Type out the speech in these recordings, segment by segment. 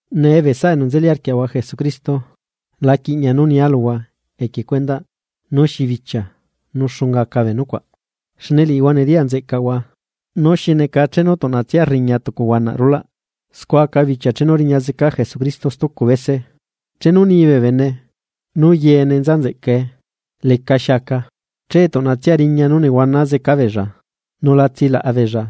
Nee bee saꞌa enu nzeli arquiaꞌahua Jesucristo la quiꞌñia nú nia luhua equie cuendaꞌ nú xi bichia nu xunga aca bee nucuaꞌ. Xne liꞌihua nediyaꞌ nzeꞌcaꞌhua nú xi neca chenu tuꞌnatsia rriña tucu huanaꞌ rulaꞌ, scua aca bichia chenu riña zeca Jesucristo stucu bese. Chenu ni bee bene: “Nú yene nza nzeꞌcae, lecaxi aca”, che tuꞌnatsia riña nú nehuana zeca beella nu la tsilaꞌa beella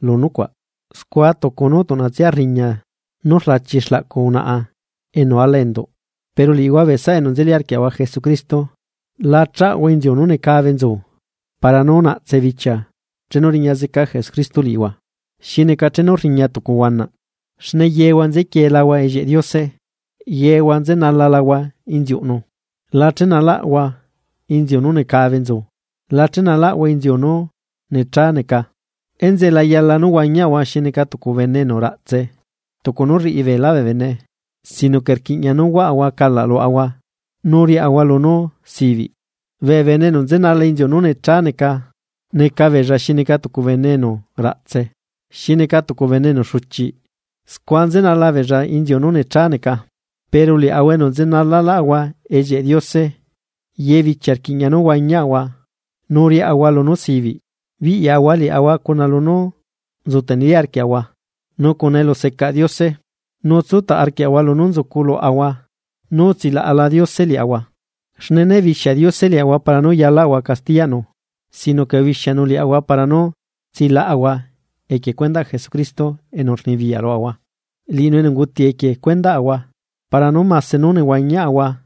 lu nucuaꞌ, scua tucu nú tuꞌnatsia rriña nú rlachi xlaꞌcu unaꞌa enu ala enduꞌ. Pero liꞌihua bee saꞌa enu nzeli arquiaꞌahua Jesucristo, la chahua inziu nú necabe nzu para nú la naꞌtse bichia chenu riña zeca Jesucristo liꞌihua, xi neca chenu rriña tucu huanaꞌ. Xne yehua nzequielahua ellieꞌ Diose, yehua nzenalahua inziuꞌnu. La chenalaꞌahua inziu nú necabe nzu, nu leꞌca la chenalaꞌahua inziu nú nechá neca. Enzeꞌe la yala nú huañiaꞌahua xi neca tucu bene enu raꞌtse, tucu nú rriꞌi beelá bee bene, sino que rquiꞌña nú huaꞌahua calaꞌ luaꞌahua nu riaꞌahua lunú sibiꞌ. Bee bene enu nzenala inziu nú nechá neca, neca beella xi neca tucu bene enu raꞌtse, xi neca tucu bene enu xuchiꞌ, scua nzenala beella inziu nu necha neca. Pero liaꞌahua enu nzenalalaꞌahua ellieꞌ Diose, ye bichia rquiꞌña nú huañiaꞌahua nu riaꞌahua lunú sibiꞌ. Biꞌyaꞌahua liaꞌahua lunú nzu teneli arquiaꞌahua lu elu secaꞌ Diose, nu tsutaꞌ arquiaꞌahua lunú nzuculuaꞌahua nú utsilaꞌala Diose liaꞌahua. Xne né bixia Diose liaꞌahua para nú liquiꞌnu castiya luaꞌahua, sino que ubixianu liaꞌahua para nú tsilaꞌahua equie cuendaꞌ Jesucristo enu rnibiyaꞌ luaꞌahua. Liꞌinu enu unguti equie cuendaꞌahua para nú mase nú nehuañiaꞌahua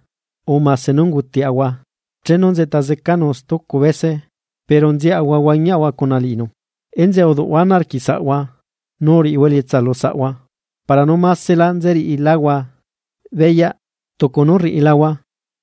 urre mase nú ungutilaꞌahua chenu nzeꞌta zecanu stucu bese, pero nziaꞌahua huañiaꞌahua cuna liꞌinu. Enzeꞌe uduꞌhua ana arquiꞌ saꞌhua nu uriꞌihua elietsa lu saꞌhua para nú másela nzeriꞌiláhua beyaꞌ lunú rriꞌilahua.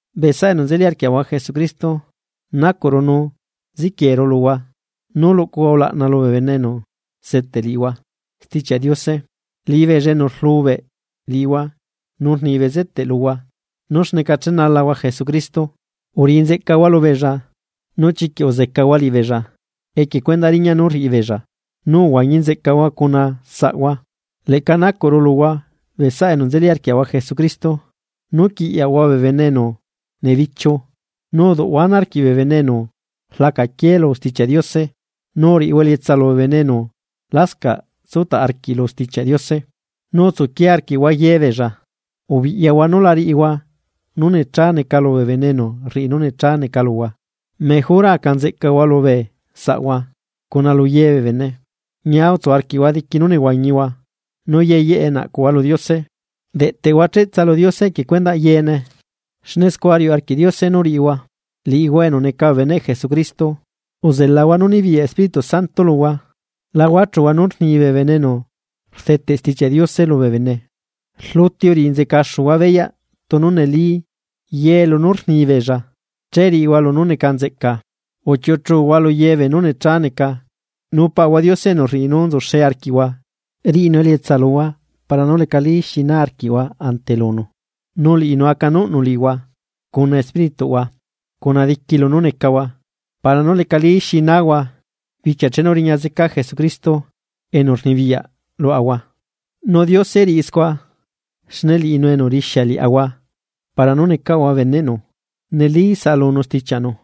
Bee saꞌa enu nzeli arquiaꞌahua Jesucristo, nacuꞌru nu ziquieru luhua, nú luꞌcuhua ulaꞌna lu bee bene enu seteꞌ liꞌihua Stichiaꞌ Diose. Liꞌibeella enu seteꞌ liꞌihua nu rni bezeteꞌ luhua nú xneca chenalahua Jesucristo. Uriꞌi nzeꞌcahua lubeella nu chiquiꞌ uzecahua liꞌibeella equie cuendaꞌ riñaꞌ nú rriꞌi beella. Nu uhuañi nzeꞌcahua cuna saꞌhua. Leꞌca nacuꞌru luhua bee saꞌa enu nzeli arquiaꞌahua Jesucristo nú quiꞌyaꞌhua bee bene enu nebichiu nu uduꞌhua ana arquiꞌ bee bene enu rlacaquié lu Stichiaꞌ Diose nu uriꞌihua elietsa lu bee bene enu lascaꞌ tsutaꞌ arquiꞌ lu Stichiaꞌ Diose, nu utsuquie arquiꞌhua ye beella. Ubiꞌyahua nú la riꞌihua nú nechá neca lu bee bene enu rriꞌi nú nechá neca luhua, mejora aca nzeꞌcahua lu bee saꞌhua cuna lu ye bee bene. Ñia tsu arquiꞌhua diqui nú nehuañihua. Nu yee yeꞌe naꞌcuhua lu Diose. Deꞌtehua cheꞌtsa lu Diose equie cuendaꞌ yeene, xne scua riuꞌ arquiꞌ Diose nú riꞌihua, liꞌihua enu neca bee beneꞌ Jesucristo. Uzelahua nú nibiyaꞌ Espíritu Santo luhua. La huachuhua nu rni bee bene enu rdeteꞌ Stichiaꞌ Diose lubee bene. Rluti uriꞌi nzeꞌcaxuhua beyaꞌ tunu neli ye lunú rni beella, nu riꞌihua lunú neca nzeꞌca. Uchiuꞌu chuhua lu ye beenú nechá neca. Nu Paꞌahua Diose enu rriꞌi nú nzuxe arquiaꞌahua riꞌinu elietsa luhua para nú lecali xi na arquiꞌhua ante lunu. Nu liꞌinu acanuꞌnu liꞌihua, cuna espírituꞌhua, cuna diqui lunú necahua para nú lecali xi nahua bichia chenu riña zeca Jesucristo enu rnibiyaꞌ luaꞌahua. Nu Diose riꞌi scua, xne liꞌinu enu rixia liaꞌahua para nú necaꞌahua beneꞌnu, neli saꞌalunu stichiaꞌnu.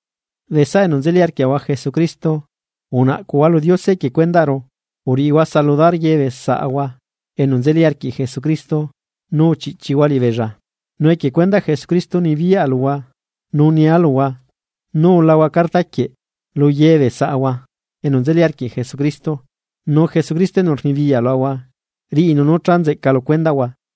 Bee saꞌa enu nzeli arquiaꞌahua Jesucristo, unaꞌcuꞌhua lu Diose equie cuendaꞌru. Uriꞌihua saludar ye bee saꞌahua enu nzeli arquiꞌ Jesucristo nu uchiꞌchihua liꞌibeella. Nu equie cuendaꞌ Jesucristo nibiyaꞌa luhua nu nia luhua, nú ulahua carta quieꞌ lu ye bee saꞌahua enu nzeli arquiꞌ Jesucristo. Nu Jesucristo enu rnibiyaꞌ luaꞌahua riꞌinu nú cha nzeꞌca lu cuendaꞌhua.